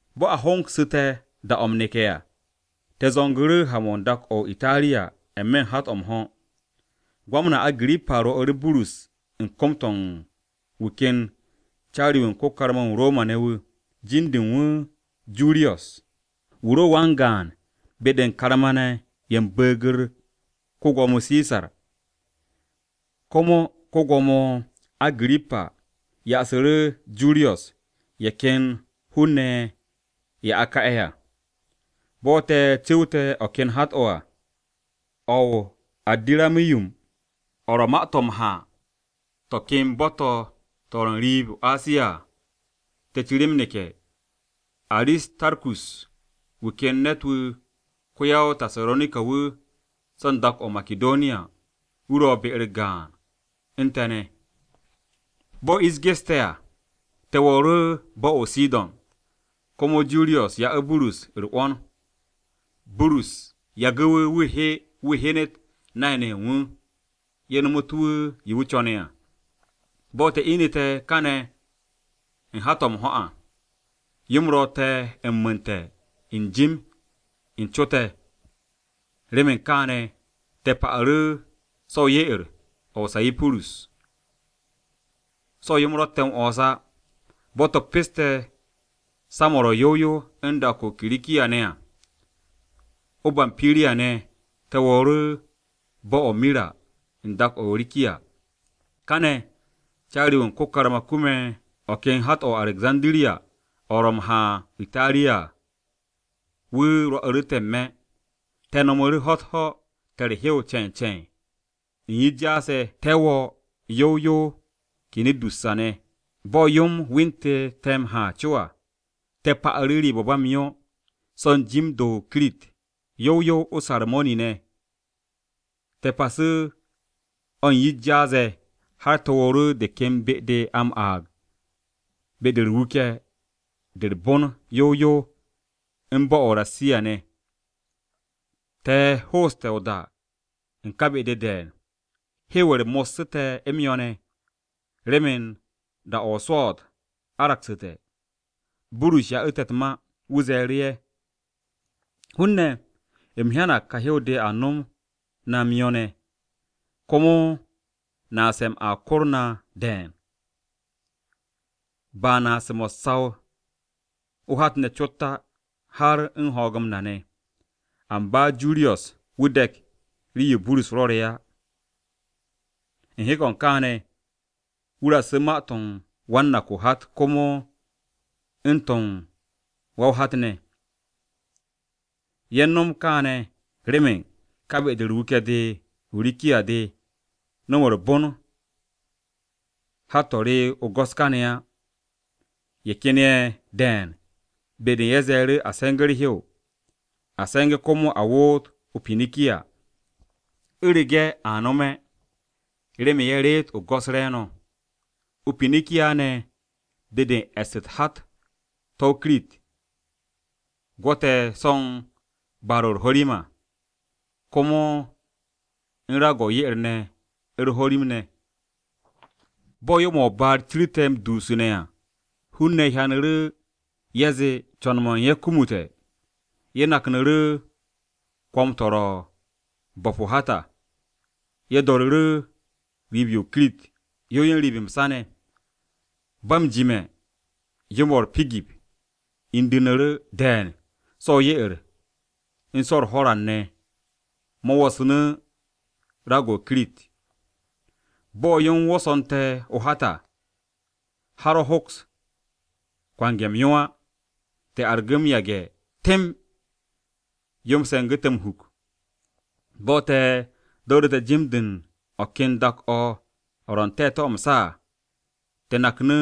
Bo̱ a hongsu̱te̱ da-o̱ m-neke̱ à, te̱ zo̱ngu̱ru̱ ha-mo̱ n-dak o̱ o-Itariya n-me̱ o-hat o̱ m-ho̱. Ko-Gwamna Agirippa rwo̱'u̱ru̱ Burus u̱n kom-to̱ u̱n wu̱ ken caari-wu̱ u̱n ko-karma-wu̱ u̱n Roma-ne̱ wu̱. Jin-de u̱n wu̱ Juriyos. Wu̱ ro wan-gaan be-de u̱n karma-ne̱ ye̱ u̱n Bu̱u̱g-u̱r ko-Gwo̱mo Sisar. Komo ko-Gwo̱mo Agirippa ya'asu̱ru̱ Juriyos ye̱ ken hun-ne̱ ye̱ a ka'e̱ à. Bo̱ te̱ cu̱wte̱ o̱ ken hat-o̱ à o̱ o-Adiramiyum, o̱ ro̱ ma-to̱ m-ha to̱ ken bo̱-to̱ to̱ ro̱ n-riib o-Asiya à, te̱ ciri m-neke̱. Aristarkus, wu̱ ken ne̱t-wu̱ ko-ya-o-Tasaronika-wu̱ so̱ n-dak o̱ o-Makidoniya, wu̱ ro̱ be-u̱r gaan u̱n te̱ ne̱. Bo̱ ish geste̱ à, te̱ wo̱o̱ru̱ bo̱-o̱ o-Sidon, komo Juriyos ya'u̱ Burus u̱r-'wo̱n, Burus yagu̱ wu̱, wu̱ he wu̱ hyenet nay-ne̱ ye̱ u̱n wu̱, ye̱ nomotu̱ wu̱ yo wu̱ co̱ne̱ à. Bo̱ te̱ inu̱te̱ kane̱ u̱n hat-o̱ m-ho̱ à, yo-m ro te̱ m-mu̱u̱nte̱ n-jim n-co te̱. Remen kaane̱, te̱ pa'u̱ru̱ so̱ o-ye'er o̱ o-Sayipurus so̱ yo-m ro̱tte̱ m-'wo̱ns á. Bo̱ te̱ peste̱ sa-mo̱ ro̱ yow yow n-dak o̱ o-Kirikiya ne̱ à, o-Bampiriya ne̱, te̱ wo̱o̱ru̱ bo̱-o̱ o-Mira u̱n dak-o̱ o-Rikiya. Kane̱, caari-wu̱ u̱n ko-karma kume̱ o̱ ken hat-o̱ o-Arekzandiriya o̱ ro̱ m-ha o-Itariya à, wu̱ rwo̱'u̱ te̱ n-me̱. Te̱ nomu̱ru̱ ho̱-u̱t u̱t-ho̱ te̱ u̱r-hew ce̱e̱n ce̱e̱n, u̱n yish jaas-ye̱ te̱ wo̱o̱ yow yow o-Kinidusa ne̱. Bo̱ yo-m wentu̱ te̱ m-ha co à, te̱ pa'u̱ru̱ riib-o̱ u̱n ba m-yo, so̱ u̱n jim-de u̱n o-Kirit yow yow o-Sarmoni ne̱. Te̱ pasu̱ o̱ u̱n yish jaas-ye̱, har te̱ wo̱o̱ru̱ de ken be-de a m-aag be-de u̱r-Wuke̱ de u̱r-Bon yow yow u̱n bo̱-o̱ o-Rasiya ne̱. Te̱ hooste̱ o-da u̱n ka be-de de̱e̱n, hew-u̱r mo̱ssu̱ te̱ m-yo̱ ne̱, remen da-o̱ o-swo̱o̱t aragsu̱te̱. Burus ya'u̱ ye̱ u̱t-ma. Wu̱ ze̱e̱ru̱ ye̱, “Hun-ne̱, u̱m hyanag ka hew-de a nom na m-yo̱ ne̱, komo naase̱-m a kor na de̱e̱n, ba naase̱-mo̱ u̱s-saw o-hat ne̱ cot á, har u̱n ho̱o̱g-m na ne̱.” Amba Juriyos wu̱ dek rii-yo Burus rwo̱re̱ á. U̱n hek-o̱ u̱n kaane̱, wu̱ raksu̱ ma-to̱ u̱n wan-nak-o-hat komo u̱n to̱ u̱n wa-o-hat ne̱. Ye̱ u̱n no̱m kaane̱ remen ka be-de u̱r-wuke̱ de o-Rikiya de nom u̱r-bon hat-to̱ re̱ o-go̱s kane̱ á. Ye̱ ken ye̱ de̱e̱n be-de u̱n ye̱ ze̱e̱ru̱ a se̱nge̱ u̱r-hew, a se̱nge̱ komo a woot o-Pinikiya, u̱rege̱ a nome̱, remen ye̱ reet o-go̱s re̱e̱no̱. O-Pinikiya ne̱ be-de u̱n e̱s u̱t-hat to̱ o-Kirit, o̱ gwo̱te̱ so̱ u̱n baar-o̱ u̱r-ho̱rim à, komo u̱n raag-o̱ ye'er-o̱ u̱r-ho̱rim ne̱. Bo̱ yo-mo̱ o-baar cirte̱ m-dusune̱ à hun-ne̱ hyanu̱ru̱ ye̱ zee co̱n-mo̱ u̱n ye̱ kumute̱, ye̱ naknu̱ru̱ kwo̱m-o̱ ro̱ u̱n bo̱p o-hat à, ye̱ do̱ru̱ru̱ riib-yo o-Kirit, yow yow u̱n riib m-sa ne̱. Ba m-jime̱ yo-mo̱ u̱r-pigip indu̱ndu̱ru̱ de̱e̱n so̱ o-ye'er u̱n so̱ u̱r-ho̱ran ne̱ mo̱ wo̱snu̱ raag-o̱ o-Kirit. Bo̱ yo-m wo̱so̱nte̱ o-hat à, har o̱ hoks kwange̱ m-yo á. Te̱ argu̱ m-yage̱ temb yo-m se̱ngu̱ te̱ m-huk. Bo̱ te̱ do̱ru̱te̱ u̱n jim-de u̱n o̱ ken dak-o̱ o̱ ro̱ n-te̱te̱ m-sa à, te̱ naknu̱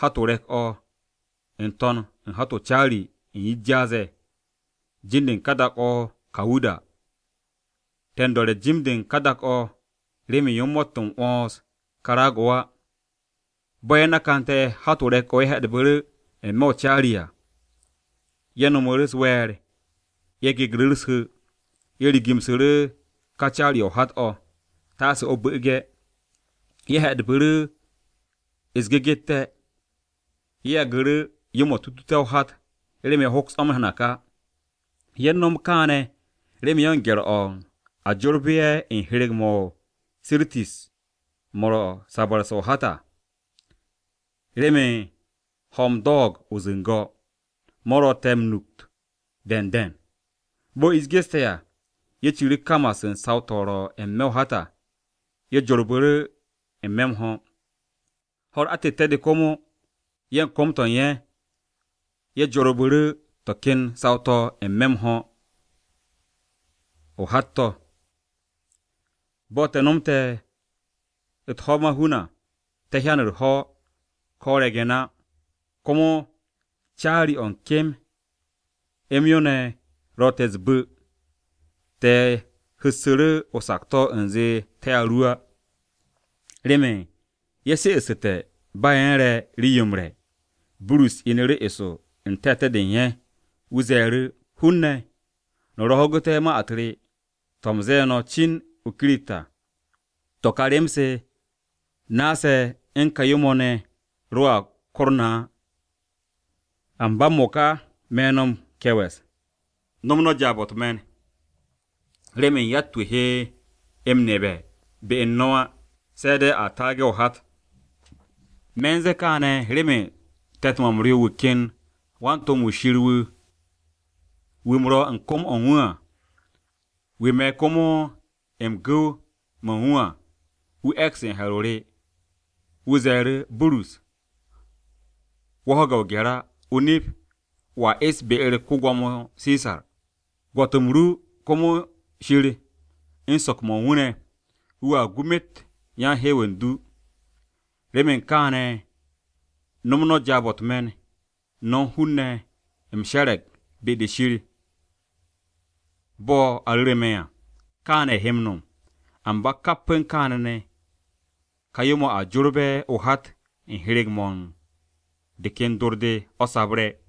hat-o re̱k-o̱ n-to̱n u̱n hat-o o-caari u̱n yish jaas-ye̱. Jin-de u̱n ka dak-o̱ o-Kawuda. Te̱ u̱n do̱re̱ jim-de u̱n ka dak-o̱ remen yo-m mo̱tt m-'wo̱ns ka raag-o̱ á. Bo̱ ye̱ nakante̱ hat-o re̱k-o̱ ye̱ he̱'e̱dbu̱ru̱ n-me̱ o-caari à, ye̱ no̱mu̱ u̱s-we̱e̱r, ye̱ gegru̱ u̱s-hu̱, ye̱ rigu̱msu̱ru̱ ka caari-o̱ o-hat o̱, taase o̱ bu̱'u̱ge̱. Ye̱ he̱'e̱bu̱ru̱ u̱s-gegette̱. Ye̱ yagu̱ru̱ yo-mo̱ tutute̱ o-hat remen ye̱ hoks o̱ m-nak á. Ye̱ u̱n nom kaane̱ remen ye̱ u̱n gye̱r-o̱ u̱n a jorbe̱ ye̱ u̱n hyereg-mo̱ o-Sirtis mo̱ ro̱ u̱n sabu̱rse̱ o-hat à. Remen ho̱-m do̱o̱g o-zu̱ngo̱, mo̱ ro̱ te̱ m-nukt de̱e̱n de̱e̱n. Bo̱ ish geste̱ à, ye̱ ciru̱ kamas u̱n saw-to̱ ro̱ n-me̱ o-hat à, ye̱ jorbu̱ru̱ n-me̱ m-ho̱. Ho̱-u̱r atette̱-de komo, ye̱ u̱n kom-to̱ u̱n ye̱, ye̱ jorbu̱ru̱ to̱ ken saw-to̱ m-se̱nge̱ mo̱ o-hat to̱. Bo̱ te̱ nomte̱ u̱t-ho̱ m-mahun à, te̱ hyan u̱r-ho̱ ko̱ o-re̱ge̱n á, komo caari-o̱ u̱n kem m-yo ne̱ ro̱ te̱ u̱s-bu̱. Te̱ hu̱ssu̱ru̱ o-sakto̱ u̱nze te̱a ru. Remen ye̱ she'essu̱te̱ ba ye̱ u̱n re̱ rii-yo m-re̱, Burus inu̱ru̱ eso u̱n te̱te̱-de u̱n ye̱. Wu̱ ze̱e̱ru̱, “Hun-ne̱, no̱ ro ho̱gu̱te̱ ma-u̱t re to̱ u̱m ze̱e̱ no̱ cin o-Kirit à, to̱ ka rem-se naase̱ u̱n ka yo̱-mo̱ ne̱ roa kor no̱ á. Amba m-mo̱ka, me̱ no̱ m-ke̱we̱s no̱m no̱ jaab-o̱ u̱t-me̱n, remen yatt-wu̱ he m-nebe̱ be u̱n no̱ á, se̱ de̱ a taage̱ o-hat. Me̱ u̱n ze̱e̱ kaane̱ remen te̱t-mo̱ m-ryo wu̱ ken wan-to̱m-wu̱ Shir wu̱, wu̱ u̱m ro̱ u̱n kom-o̱ u̱n wu̱ à, wu̱ me̱ komo u̱n gu̱w-mo̱ u̱n wu̱ à, wu̱ e̱ks u̱n he̱r-o re. Wu̱ ze̱e̱ru̱, ‘Burus, wo̱ ho̱ge̱ o-gye̱r á. O-nip wo̱a e̱s be-u̱r ko-Gwo̱mo Sisar. Gwo̱t u̱n rem ru komo Shir u̱n so̱k-mo̱ u̱n wu̱ ne̱, wu̱a gu myet yan-hew u̱n du.’ Remen kaane̱ nom no̱ jaab-o̱ u̱t-me̱n, no̱ hun-ne̱, u̱m she̱re̱g be-de Shir bo̱ a ru̱ru̱ me̱ à, kaane̱ he m-nom. Amba kap u̱n kaane̱ ne̱, ka yo-mo̱ a jorbe̱ o-hat u̱n hyereg-mo̱ u̱n de ken dor-de, o̱ sabre̱.”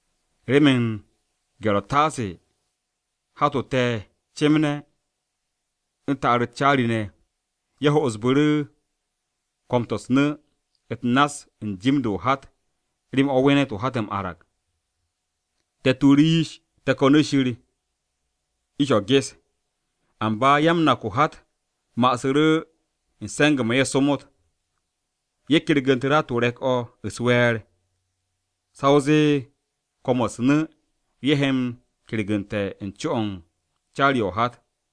Remen u̱n gye̱r-o̱ taase hat-o te̱ cemne̱ u̱n ta'ar-u̱t caari-ne̱, ye̱ ho'osbu̱ru̱ kwo̱m-to̱ u̱s-nu̱ u̱t-nass u̱n jim-de o-hat remen a wenet o-hat m-arag. Ye̱ tuuru̱ yish, ye̱ ko̱nu̱ Shir ish-o̱ ges. Amba ya-m-nak-o-hat ma'asu̱ru̱ u̱n se̱nge̱-mo̱ ye̱ somot. Ye̱ kergu̱ntu̱ru̱ hat-o re̱k-o̱ u̱s-we̱e̱r sa o zee kwo̱m-o̱ u̱s-nu̱ ye̱ he m-kergu̱nte̱ u̱n co-o̱ u̱n caari-o̱ o-hat.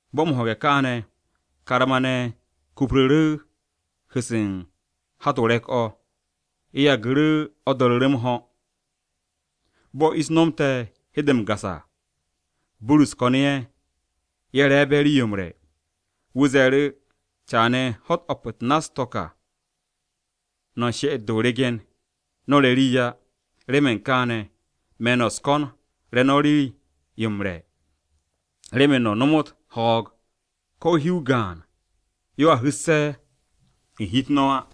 Bo̱ m-ho̱ge̱ kaane̱, karma-ne̱ kupru̱ru̱ hu̱-se u̱n hat-o re̱k-o̱, ye̱ yagu̱ru̱ o̱ do̱ru̱ru̱ m-ho̱. Bo̱ ish nomte̱ u̱n hede m-gas à, Burus ko̱nu̱ ye̱, ye̱ re̱e̱be̱ rii-yo m-re̱. Wu̱ ze̱e̱ru̱, “Caane̱, ho̱-u̱t o̱p-u̱t nass-to̱ ka no̱ u̱n she'et-de o-regen, no̱ re̱ rii á. Remen kaane̱, me̱ no̱ u̱s-ko̱n re̱ no̱ rii-yo m-re̱ remen no̱ nomot ho̱o̱g ko̱ hi-o gaan-yo a hu̱sse̱ u̱n hi-u̱t no̱ á.”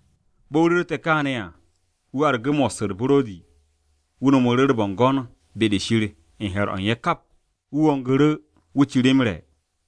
Bo̱ wu̱ ru̱rte̱ kaane̱ à, wu̱ argu̱ mos u̱r-buro̱di, wu̱ no̱mu̱ru̱ u̱r-bo̱ngo̱n be-de Shir u̱n he̱r-o̱ u̱n ye̱ kap, wu̱ wongu̱ru̱ wu̱ ciri m-re̱.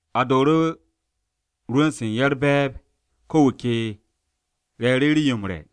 A dooru̱ rwu̱n-se u̱n ye̱ u̱r-be̱e̱b ko wu̱ ke re̱e̱ru̱ rii-yo m-re̱.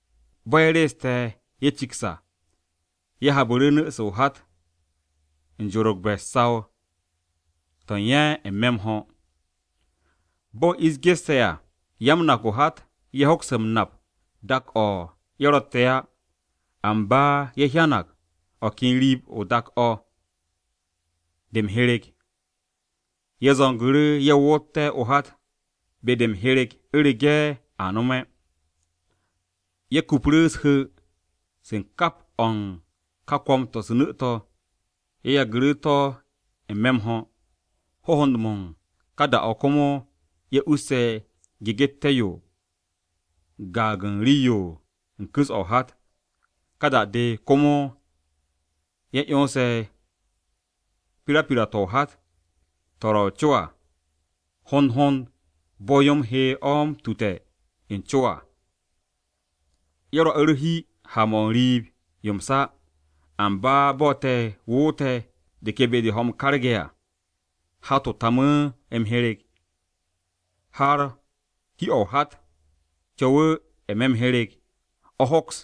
Bo̱ ye̱ reeste̱ ye̱ ciks à, ye̱ habu̱ru̱ nu̱-se o-hat be-de u̱n jorogbe̱ u̱n saw-to̱ u̱n ye̱ n-me̱ m-ho̱. Bo̱ ish geste̱ à, ya-m-nak-o-hat ye̱ hoks m-nap dak-o̱ ye̱ ro̱tte̱ á, amba ye̱ hyanag o̱ ken riib-o dak-o̱, o̱ m-hyereg. Ye̱ zo̱ngu̱ru̱ ye̱ wo̱tte̱ o-hat be-de m-hyereg u̱rege̱ a nome̱. Ye̱ kupru̱ u̱s-hu̱ se u̱n kap o̱ u̱n ka kwo̱m-to̱ u̱s-nu̱ to̱, ye̱ yagu̱ to̱ n-me̱ m-ho̱. Hohond-mo̱ u̱n ka da-o̱ komo ye̱ usse̱ gegette̱-yo u̱n gaag u̱n rii-yo u̱n kwu̱s o-hat. Ka da-de, komo ye̱ 'yonse̱ pirapira-to̱ o-hat to̱ ro̱ o-co à hond hond bo̱ yo-m he o̱ m-tute̱ o-co à. Ye̱ rwo̱'u̱ u̱r-hi ha-mo̱ n-riib yo m-sa. Amba bo̱ te̱ woote̱ de ken be-de ho̱-m mo̱ m-karge̱ à, hat-o tamu̱ m-hyereg, har hi-o̱ o-hat co̱wu̱ n-me̱ m-hyereg o̱ hoks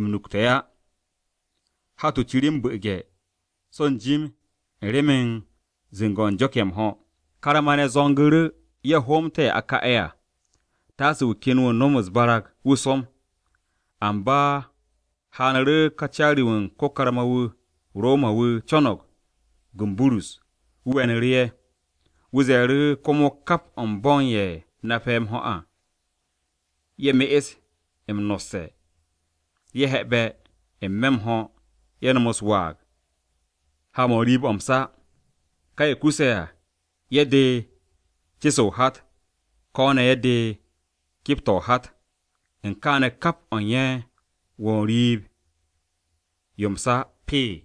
m-nukte̱ á. Hat-o ciri m-bu̱'u̱ge̱ so̱ n-jim u̱n remen zu̱ngo̱-o̱ u̱n jo̱k-ye̱ m-ho̱. Karma-ne̱ zo̱ngu̱ru̱, ye̱ hoomté̱ ye̱ a ka'e̱ a taase wu̱ ken wu̱ nom u̱s-waag wu̱ som. Amba haanu̱ru̱ ká caari-wu̱ u̱n ko-karma-wu̱ o-Roma wu̱ co̱no̱g gu u̱n Burus, wu̱ we̱nu̱ru̱ ye̱. Wu̱ ze̱e̱ru̱ komo kap o̱ u̱n bo̱ u̱n ye̱ nape̱ m-ho̱ à, ye̱ me'es m-nosse̱, ye̱ he̱'e̱be̱ n-me̱ m-ho̱ ye̱ nom u̱s-waag ha-mo̱ n-riib o̱ m-sa, ka ye̱ kuse̱ à, ye̱ de ce-se o-hat, ko̱ ne̱ ye̱ de kep-to̱ o-hat. U̱n kaane̱ kap mo̱ u̱n ye̱ wo̱o̱ riib-yo m-sa pee.